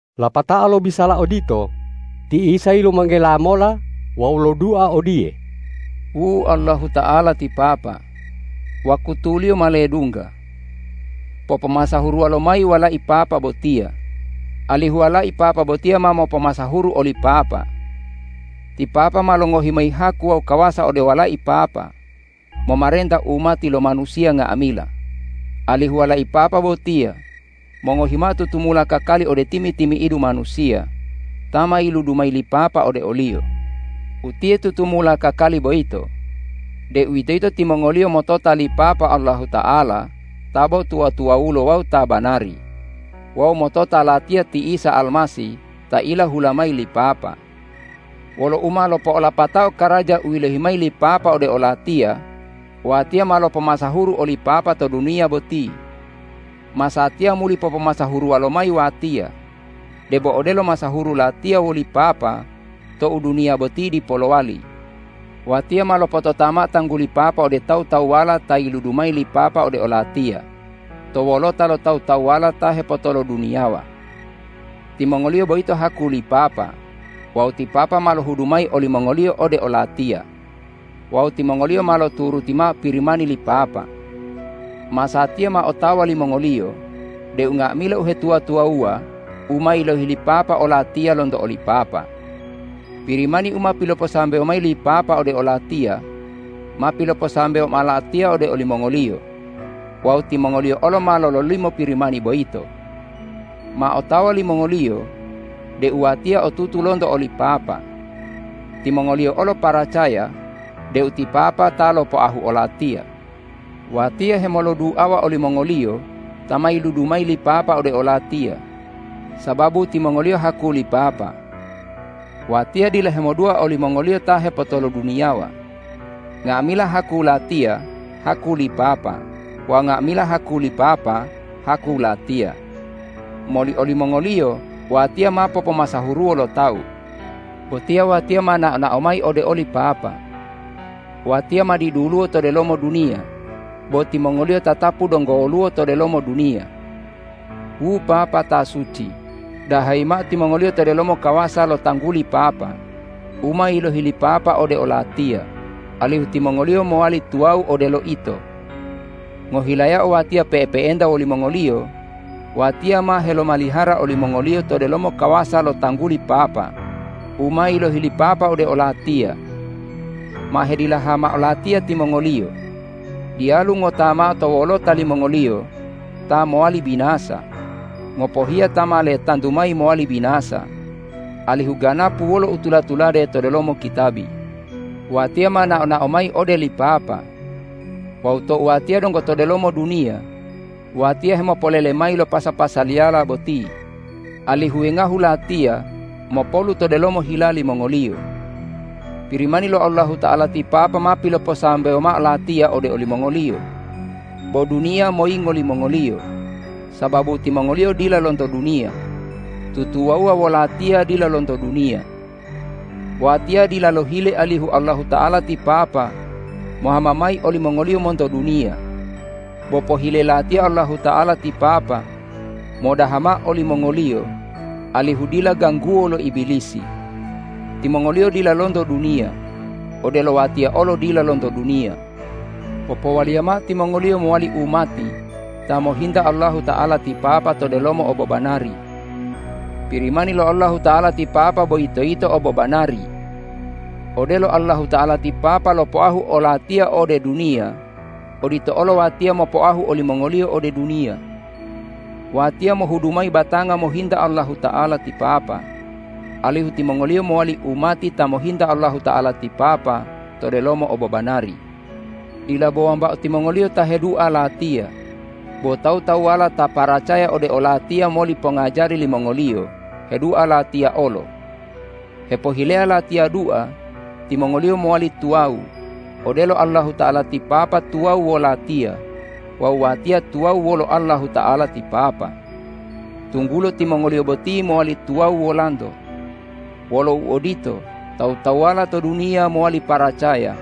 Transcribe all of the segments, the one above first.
Lapatao lobisala odito, ti Isa yilumanggela mola wawu lodua odiye,”Wu Allahuta'ala ti Papa, wakutuliyo ma ledungga. Popomasahuruwa lomayi Walai Papa botiya, alihu Walai Papa botiya ma mopomasahuru oli Papa. Ti Papa ma longohi mayi haku wawu kawasa ode Walai Papa momarenta umati lo manusiya nga'amila, alihu Walai Papa botiya mongohi mao tutumula kakali ode timi-timi'idu manusiya ta ma yiludu mayi li Papa ode o-Liyo. Utiye tutumula kakali boyito, deuwitoyito timongoliyo motota li Papa Allahuta'ala ta bo tuwa-tuwawulo wawu ta banari, wawu motota Latiya ti Isa Almasih ta ilahula mayi li Papa. Wolo u ma lopo'olapatao karaja u yilohi mayi li Papa ode o-Latiya, Watiya ma lopomasahuru oli Papa to duniya boti. Masatiya muli popomasahuruwa lomayi Watiya, debo odelo masahuru Latiya woli Papa tou duniya boti dipo lowali. Watiya ma lopotota mao tangguli Papa ode tawu-tawuwala ta yiludu mayi li Papa ode o-Latiya to wolota lo tawu-tawuwala ta hepotoloduniyawa. Timongoliyo boyito haku li Papa wawu ti Papa ma lohudu mayi olimongoliyo ode o-Latiya wawu timongoliyo ma loturuti mao Pirimani li Papa. Masatiya ma otawa limongoliyo deu nga'amila uhetuwa-tuwawuwa u ma yilohi li Papa o-Latiya lonto oli Papa. Pirimani u ma piloposambewo mayi li Papa ode o-Latiya ma piloposambewo mao Latiya ode olimongoliyo wawu timongoliyo olo ma lololimo Pirimani boyito. Ma otawa limongoliyo deu Watiya otutu lonto oli Papa. Timongoliyo olo paracaya deu ti Papa ta lopoahu o-Latiya. Watiya hemoloduawa olimongoliyo ta ma yiludu mayi li Papa ode o-Latiya sababu timongoliyo haku li Papa. Watiya dila hemodua olimongoliyo ta hepotoloduniyawa. Nga'amila haku Latiya haku li Papa wawu nga'amila haku li Papa haku Latiya. Moli olimongoliyo Watiya ma popomasahuruwo lo tawu. Botiya Watiya ma nao-nao mayi ode oli Papa. Watiya ma diduluwo to delomo duniya, bo timongoliyo tatapu donggo woluwo to delomo duniya. Wu Papa ta suci, dahayi mao timongoliyo to delomo kawasa lo tangguli Papa u ma yilohi li Papa ode o-Latiya, alihu timongoliyo mowali tuwawu odelo Ito. Ngohilayao Watiya pe'epe'enta wolimongoliyo, Watiya ma helomalihara olimongoliyo to delomo kawasa lo tangguli Papa u ma yilohi li Papa ode o-Latiya. Ma hedilaha mao Latiya timongoliyo. Diyalu ngota mao to wolota limongoliyo ta mowali binasa, ngopohiya ta ma letantu mayi mowali binasa alihu ganapu wolo u tula-tulade to delomo kitabi. Watiya ma nao-nao mayi ode li Papa. Wawu tou Watiya donggo to delomo duniya, Watiya hemopolele mayi lo pasa-pasaliyala boti, alihu wengahu Latiya mopolu to delomo hila limongoliyo. Pirimani lo Allahuta'ala ti Papa ma piloposambewo mao Latiya ode olimongoliyo, bo duniya moyingo limongoliyo, sababu timongoliyo dila lonto duniya, tutuwawuwa wo-Latiya dila lonto duniya. Watiya dila lohile alihu Allahuta'ala ti Papa mohama mayi olimongoliyo monto duniya, bo pohile Latiya Allahuta'ala ti Papa modaha mao olimongoliyo alihu dila gangguwo lo Ibilisi. Timongoliyo dila lonto duniya, odelo Watiya olo dila lonto duniya. Popowaliya mao timongoliyo mowali umati ta mohinta Allahuta'ala ti Papa to delomo obobanari. Pirimani lo Allahuta'ala ti Papa boyito yito obobanari. Odelo Allahuta'ala ti Papa lopoahu o-Latiya ode duniya, odito olo Watiya mopoahu olimongoliyo ode duniya. Watiya mohudu mayi batanga mohinta Allahuta'ala ti Papa, alihu timongoliyo mowali umati ta mohinta Allahuta'ala ti Papa to delomo obobanari. Dila bo wambao timongoliyo ta hedua Latiya, bo tawu-tawuwala ta paracaya ode o-Latiya moli pongajari limongoliyo hedua Latiya olo. Hepohileya Latiya dua timongoliyo mowali tuwawu, odelo Allahuta'ala ti Papa tuwawu wo-Latiya wawu Watiya tuwawu wolo Allahuta'ala ti Papa, tunggulo timongoliyo boti mowali tuwawu Wolanto. Wolo uodito, tawu-tawuwala to duniya mowali paracaya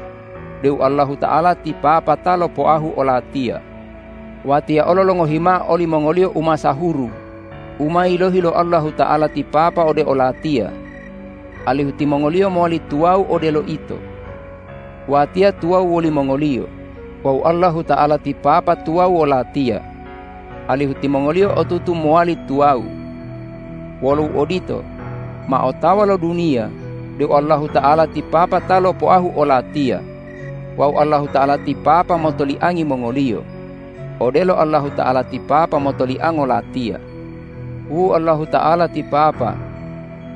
deu Allahuta'ala ti Papa ta lopoahu o-Latiya. Watiya olo longohi mao olimongoliyo umasahuru u ma yilohi lo Allahuta'ala ti Papa ode o-Latiya, alihu timongoliyo mowali tuwawu odelo Ito. Watiya tuwawu wolimongoliyo wawu Allahuta'ala ti Papa tuwawu wo-Latiya, alihu timongoliyo otutu mowali tuwawu. Wolo uodito, ma otawa lo duniya deu Allahuta'ala ti Papa ta lopoahu o-Latiya wawu Allahuta'ala ti Papa motoliangi mongoliyo, odelo Allahuta'ala ti Papa motoliango Latiya. Wu Allahuta'ala ti Papa,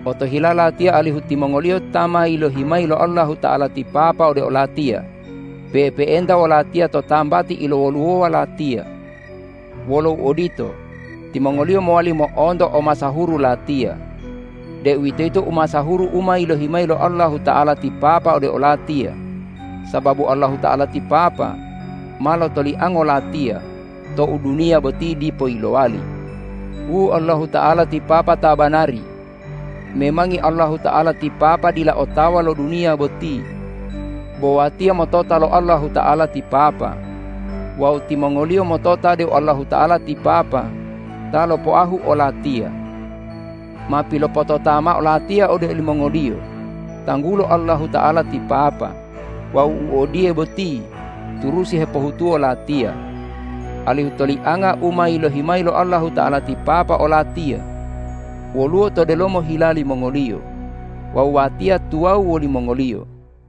otohila Latiya alihu timongoliyo ta ma yilohi mayi lo Allahuta'ala ti Papa ode o-Latiya pe'epe'enta wo-Latiya to tambati ilowoluwowa Latiya. Wolo uodito, timongoliyo mowali mo'onto omasahuru Latiya, deuwitoyito umasahuru u ma yilohi lo Allahuta'ala ti Papa ode o-Latiya sababu Allahuta'ala ti Papa ma lotoliango Latiya tou duniya boti dipo yilowali. Wu Allahuta'ala ti Papa ta banari, memangi Allahuta'ala ti Papa dila otawa lo duniya boti, bo Watiya motota lo Allahuta'ala ti Papa wawu timongoliyo motota deu Allahuta'ala ti Papa ta lopoahu o-Latiya. Ma pilopotota mao Latiya ode olimongoliyo tanggulo Allahuta'ala ti Papa wawu u odiye boti turusi hepohutuwo Latiya, alihu tolianga u ma yilohi mayi lo Allahuta'ala ti Papa o-Latiya woluwo to delomo hila limongoliyo wawu Watiya tuwawu wolimongoliyo.”